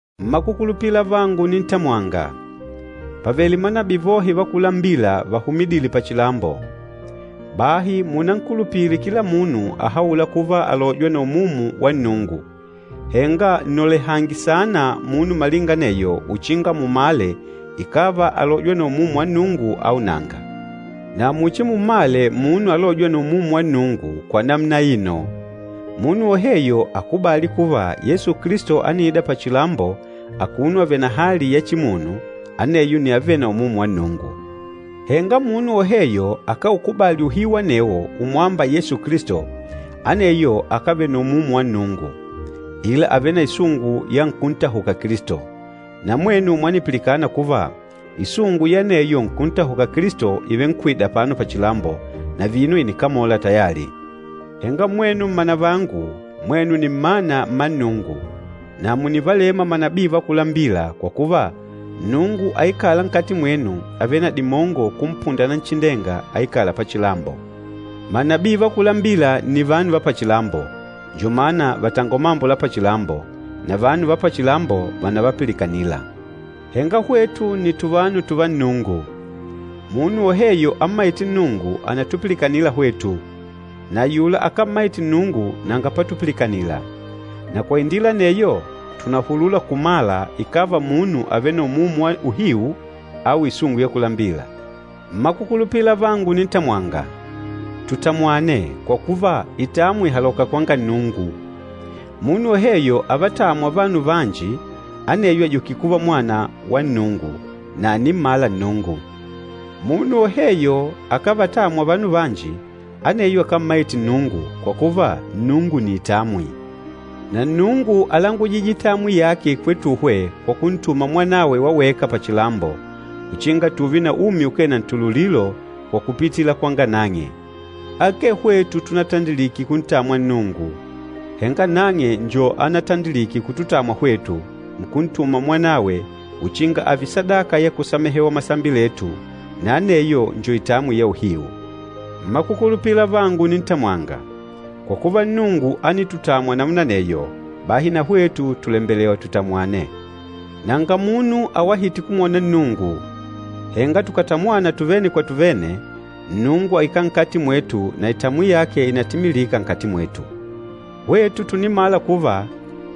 Mmakukulupila avangu unintamwanga, pàvele manabii vohe va kulambila vahumidîle pachilambo. Bahi munankulupile kila munu ahaûla kuva àlojwa na Umumu wa Nnungu, henga nnolehange saana munu malinga aneyo uchinga mumale, ikàva àlojwa na Umumu wa Nnungu au nanga. Na muchimummale munu alôjwa na Umumu wa Nnungu kwa namuna aino, munu woheyo akubâli kuva Yesu Kilisto ániida pachilambo akuno ààve na hali ya chimunu, aneyo nni avêle na Umumu wa Nnungu. Henga munu woheyo akáukubali uhiu anewo umwâmba Yesu Kilisto, aneyo akávele na Umumu wa Nnungu, ila àvele na isungu ya nkúntahuka Kilisto. Na mwenu mwanipilikana kuva isungu ya aneyo nkúntahuka Kilisto ìvenkwida apano pachilambo, na vino ìnikamola tayali. Henga mwenu mmanavangu, mwenu nni mmana mma Nnungu, na mùnivalema manabii va kulambila kwa kuva, Nnungu aikâla nkati mwenu àvele na dimongo kumpunda Nanchindenga aikâla pachilambo. Manabii va kulambila nni vanu va pachilambo, njo mana vàtangola mambo la pachilambo, na vanu va pachilambo vànavapilikanila. Henga hwetu nni tuvanu tùvá Nnungu. Munu woheyo ammaîte Nnungu ànatupilikanila hwetu, na ayula akámmaite Nnungu nanga patupilikanila. Na kwa indila aneyo, tùnahulula kumala ikàva munu àvele na Umumu wa Uhiu au isungu ya kulambila. Mmakukulupila avangu unintamwanga, tutamwane, kwa kuva, itamwi ìhaloka kwanga Nnungu. Munu woheyo avatâmwa vanu vanji aneyo àjukile kuva mwana wa Nnungu, na ànimmala Nnungu. Munu woheyo akávatamwa vanu vanji, aneyo akámmaite Nnungu, kwa kuva, Nnungu nni itamwi. Na Nnungu álangujije itamwi yake kwetuhwe kwa kuntuma Mwanawe wa weka pachilambo, uchinga tùùve na umi ukee na ntululilo kwa kupitila kwanga nang'e. Akee hwetu tunatandilike kuntamwa Nnungu, henga nang'e njo anatandilike kututamwa hwetu, nkuntuma Mwanawe uchinga ààve sadaka ya kusamehewa masambi letu, na aneyo njo itamwi ya uhiu. Mmakukulupila avangu unintamwanga, kwa kuva Nnungu ánitutamwa namuna aneyo, bahi na hwetu tùlembelewa tutamwane. Nanga munu awahîte kumwona Nnungu, henga tukàtamwana tuvene kwa tuvene, Nnungu àikala nkati mwetu na itamwi yake ìnatimilika nkati mwetu. Hwetu tùnimala kuva,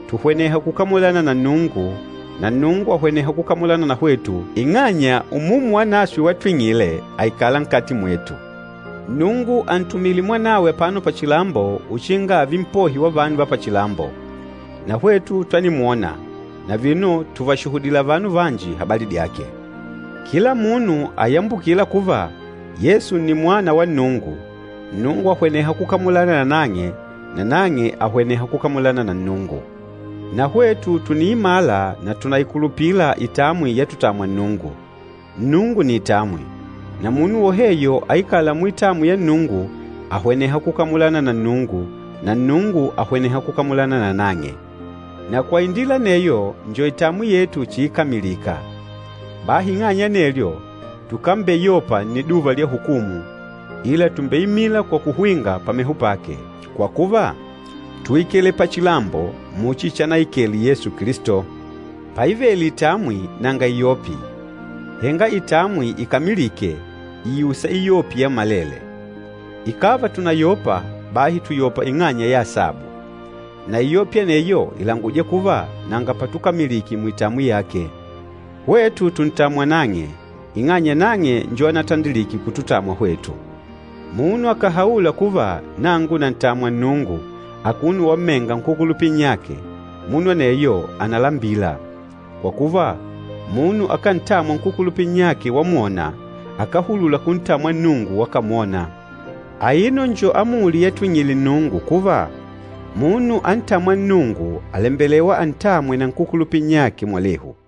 tùhweneha kukamulana na Nnungu na Nnungu àhweneha kukamulana na hwetu, ing'anya Umumu Wanaswe watwing'ile, àikala nkati mwetu. Nnungu àntumile Mwanawe apano pachilambo uchinga ààve Mpohi wa vanu va pachilambo. Na hwetu twanimwona, na vino tùvashuhudila vanu vanji habali dyake. Kila munu ayambukîla kuva, Yesu nni Mwana wa Nnungu, Nnungu àhweneha kukamulana na nang'e, na nang'e àhweneha kukamulana na Nnungu. Na hwetu tùniimala na tùnaikulupila itamwi yatutamwa Nnungu. Nnungu nni itamwi. Na munu woheyo aikâla muitamwi ya Nnungu àhweneha kukamulana na Nnungu na Nnungu àhweneha kukamulana nanang'e. Na kwa indila aneyo, njo itamwi yetu chiikamilika. Bahi ing'anya ya anelyo, tukambeyopa nniduva lya hukumu, ila tùmbeimila kwa kuhwinga pameho pake, kwa kuva, túikele pachilambo muchi chanaikele Yesu Kilisto. Paivele itamwi nanga iyopi. Henga itamwi ikamilîke, ìusa iyopi yammalele. Ikàva tùnayopa, bahi tùyopa ing'anya ya asabu. Na iyopi aneyo ìlanguja kuva nanga patukamilike muitamwi yake. Hwetu tùntamwa nang'e, ing'anya nang'e njo anatandilike kututamwa hwetu. Munu akàhaula kuva, “Nangu nàntamwa Nnungu,” akuno wammenga nkúkulupila nnyake, munu aneyo ànalambila. Kwa kuva, munu akántamwa nkúkulupila nnyake wamwona, akáhulula kuntamwa Nnungu wakamwona. Aino njo amuli yatwing'ile Nnungu kuva, munu antâmwa Nnungu àlembelewa antamwe na nkúkulupila nnyake mwalehu.